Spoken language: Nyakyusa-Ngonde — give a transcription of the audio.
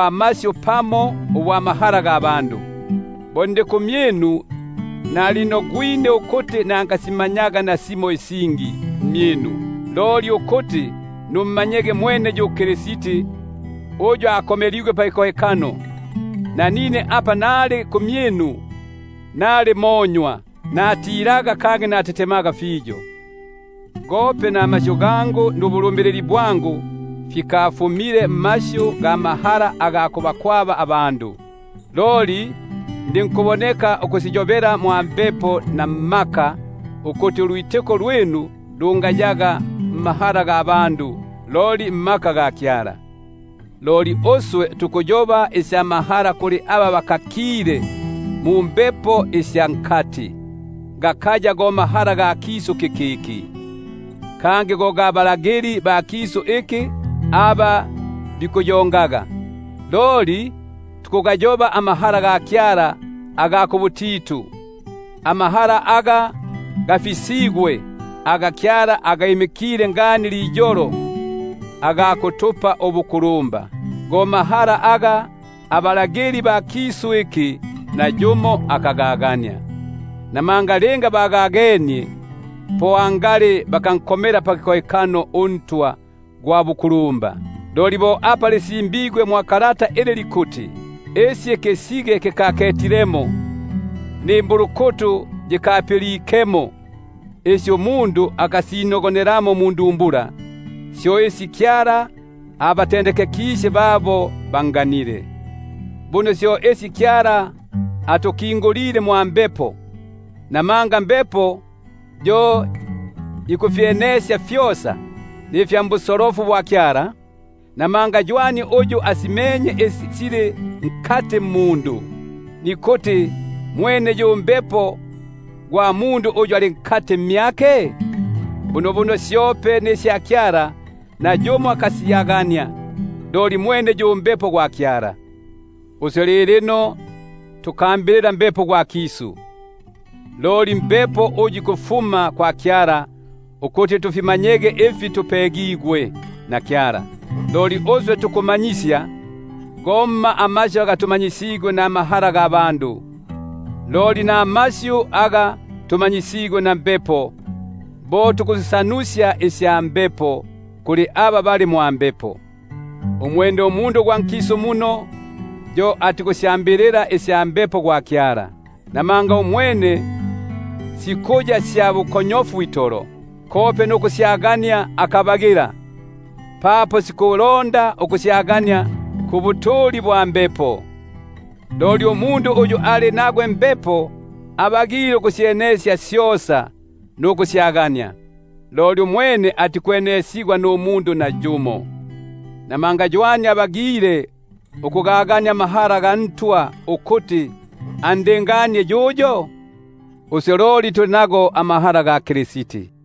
masyu pamo ubwa mahala; namanga nalinogwine ukuti nangasimanyaga nasimo isingi mmyinu, loli mwene yu Yesu Kristi uyu akomeligwe pakikohekano. Nanine apa nali kumyinu, nali monywa, natilaga kangi natetemaga fiyo; gope namasyu gangu nubulumbilili bwangu fikafumile mmasyu ga mahala aga gikutobesya, loli ndinkuboneka ukusiyobela mwa Mbepo na mu mmaka, ukuti ulwitiko lwinu lungayaga mmahala ga bandu, loli mmaka ga Kyala. Loli tukuyoba isya mahala kuli aba bafikilepo ukusyagania; gakaya go mahala ga kisu kikiki, kangi gakaya go ga balagili ba kisu iki aba bikuyongaga. Loli tukugayoba amahala ga Kyala aga kubutitu, amahala aga gafisigwe, aga Kyala agimi- kile ngani liyolo aga kutupa ubukulumba; aga akagagania nayumo mbalagili ba kisu iki, namanga linga bagagenie, po angali bakalinkomile pakikohekano uNtwa gwa bukulumba. Loli bo apa lisimbigwe ili likuti: Isi ikisige kikaketilemo, nimbulukutu yikapilikemo, Isi sikalingilemo mundumbula ya mundu, Isi Kyala abatendekekisye babo banganile. Buno syo Kyala atukingulile mwa Mbepo, namanga Mbepo yo ikufyenesya fyosa, nifya mbusolofu bwa Kyala. Namanga mbandu ywani uyu asimenye isi sili mmundu, nikuti mwene yu Mbepo gwa mundu uyu ali nkati mmyake? Bunobuno syope nisya Kyala nayumo akasyagania, loli mwene yu Mbepo gwa Kyala. Uswe tukambilila Mbepo gwa nkisu, himma, loli Mbepo uyu ikufuma kwa Kyala; ko kuti tufimanyege ifi tupegigwe na Kyala. Isi tukusiyoba, syo tutikusiyobela mmasyu aga gikufuma ndumanyisyo lwa mahala ga bandu, loli ndumanyisyo lwa Mbepo; apa tukusisanusya isya Mbepo kuli aba bali mwa Mbepo. Umwene umundu gwa nkisu muno, yo atikusyambilila isya Mbepo gwa Kyala, namanga umwene sikuya sya bukonyofu itolo; kope nukusyagania akabagila, papo sikulonda ukusyenekesya ulwa mwa Mbepo. Umundu gwa mwa Mbepo yo ikusyenesya syosa, loli umwene yo nayumo atikumwenesya. Namanga ywani uyu asyagenie inyinogono sya Ntwa ukuti andinganie yuyo? Uswe loli tuli nasyo inyinogono sya Kristi.